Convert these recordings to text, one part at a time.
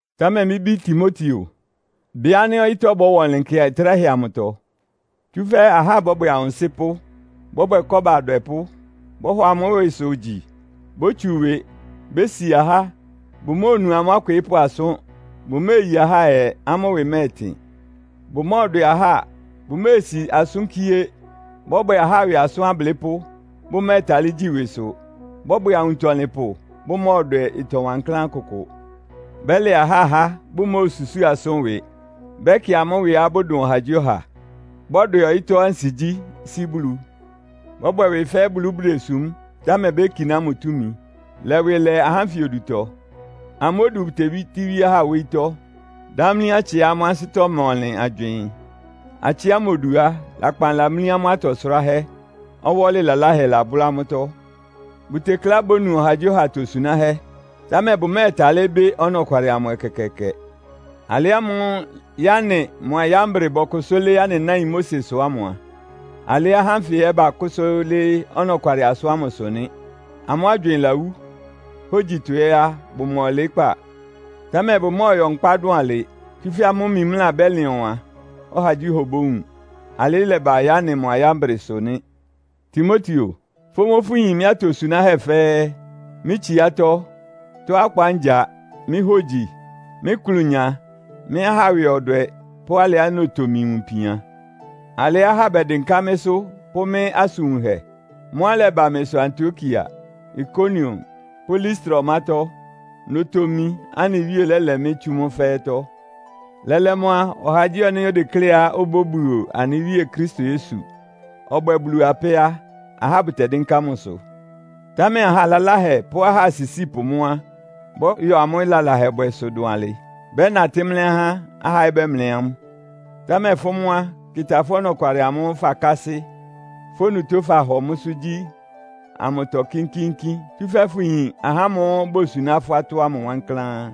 Támɛ mɩ́ bí Timoteo, bɩ ánɩ́ ɔyɩ́tɔ́ bɔ́wa ɔnlɩn nkɛ tráhɛ amʋtɔ. Tsúfɛ́ ahá bɔ́bwɛ awʋnsɩ́pʋ́, bɔ́bwɛ kɔ́ba adwɛpʋ́. Bɔ́hɔ amʋ́ ɩwɩsʋ gyi, bótsu ɩwɩ, bésia ahá, bʋmóonu amʋ́ akwɩɩ́pʋ́ asʋ́n, bʋméeyi ahá ayɛ, amʋ́ ɩwɩ mɛ́ɛtɩn, bʋmɔ́ɔdwɛ ahá, bʋméesi asʋ́n kíé, bɔ́bwɛ ahá ɩwɩ asʋ́n ablɩ́pʋ́, bʋmɛ́ɛtalɩ́ gyi ɩwɩsʋ, bɔ́bwɛ awuntɔlɩnpʋ, bʋmɔ́ɔdwɛ ɩtɔ wankláán kʋkʋ. Bɛ́lɛ ahá há, bʋmóosusúu asʋ́n ɩwɩ, bɛ́kɩ amʋ́ ɩwɩá bʋdʋn ɔhagyíɔha, bɔ́dwɛ ɔyɩ́tɔ́ ansigyí sí Bulu. Bɔ́bwɛ ɩwɩ fɛ́ Bulu bʋdesúm, támɛ békiná mʋ túmi. Lɛ ɩwɩ lɛ ahá ánfɩ odutɔ. Amʋ́ odu bʋtebítíwíé ahá wóyítɔ́, dámlí atsɩá amʋ́ ansɩ́tɔ́ ma ɔnlɩn agywɩɩn. Atsɩ ámʋ odu á, lakpan lamlí amʋ́ atɔ sʋráhɛ́, ɔwɔ́lɩ laláhɛ labʋ́lá amʋ́tɔ́. Bʋtekleá bónu ɔhagyíɔha atosunáhɛ́, támɛ bʋmɛ́ɛtalɩ́ bɩ́ ɔnɔkwalɩ amʋ ɛkɛkɛɛkɛ. Alɩ ámʋ́ʋ́ Yane mʋa Yambre bɔkʋsʋ́ lɩ́ɩ́ anɩ náin Mosesʋ ámʋ a, alɩ́ ahá ánfɩ ɛ́ bakʋ́sʋ́ lɩ́ɩ́ ɔnɔkwalɩ asʋ́n ámʋsʋ nɩ́. Amʋ́ agywɩɩn lawú. Hógyitɔ ɛ́ á, bʋma ɔlɩɩ́kpá. Támɛ bʋmɔ́ɔyɔ nkpá dʋn alɩ, tsúfɛ́ amʋ́ mimlá bɛ́lɩn ɔwan, ɔhagyíɔha obówun. Alɩ́ ɩlɛba Yane mʋa Yambresʋ nɩ́. Timoteo, fʋ́ mʋ́ fʋyin mɩ́ atosunáhɛ́ fɛ́ɛ́, mɩ́ tsiátɔ́, tɔ́á ɔkpa ngya, mɩ́ hógyi, mɩ́ ɩklʋnya, mɩ́ ahá ɩwɩ ɔdwɛ pʋ́ alɩá notomi wun ipian, alɩá ahá bɛdɩnká mɩ́sʋ́ pʋ́ mɩ́ asʋn wunhɛ. Mʋ́á ɩlɛba mɩsʋ Antiokia, Ikonion pʋ́ Listra ɔmátɔ́. Notomi, anɩ Wíe lɛ́lɛ mɩ́ tsú mʋ́ fɛ́ɛ́tɔ́. Lɛ́lɛ́ mʋ́ á, ɔhagyíɔha ánɩ́ odekléá obóbuo anɩ Wíe Kristo Yesu, ɔbwɛ́ɛ Bulu apɛ́ á, ahá bʋtɛdɩ́nká mʋsʋ. Támɛ aha laláhɛ pʋ́ ahá asisípʋ mʋ́ á, bɔ́yɔ amʋ́ lalahɛbwɛsʋ dʋn alɩ. Bɛ́natɩ́ mlɛ́ ahá, ahá ɛ́ bɛ́mlɛ́ amʋ́. Támɛ fʋ́ mʋ́ á, kɩ́tá fʋ́ ɔnɔkwalɩ amʋ́ʋ́ fakásɩ́, fʋ́ onutó fahɔ mʋ́sʋ́ gyí amʋtɔ kínkíínkín, tsúfɛ́ fʋyin ahá ámʋ́ʋ́ bosuná fʋ́ atɔ́ ámʋ wankláán.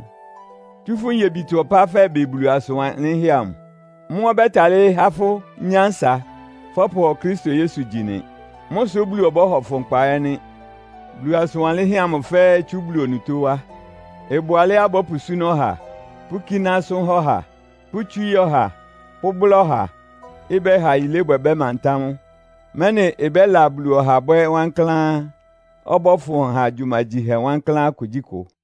Tsú fʋ́ nyebitɔ ɔpá fɛbɩ Bulu asʋn wanlɩ́nhɛ́ amʋ. Mʋ́ ɔbɛ́talɩ́ há fʋ́ nyánsa fɔ́pʋhɔ Kristo Yesu gyi nɩ. Mʋ́ sʋ Bulu ɔbɔ́hɔ fʋ nkpa ɛ́ nɩ́. Bulu asʋn wanlɩ́nhɛ́ ámʋ fɛ́ɛ́ itsú Bulu onutó wá. Ɩbʋ alɛ́á bɔ́pʋsúná ɔha, pʋ́kíná asʋ́n há ɔha, pʋ́tswíí ɔha, pʋ́bʋ́lá ɔha, ɩbɛ́ha yilébwɛ bɛ́mantá mʋ, mɛ́nɩ ɩbɛ́la Bulu ɔha bwɛ́ wankláán, ɔbɔ́fʋn ha gyumagyihɛ wankláán kugyíkʋ.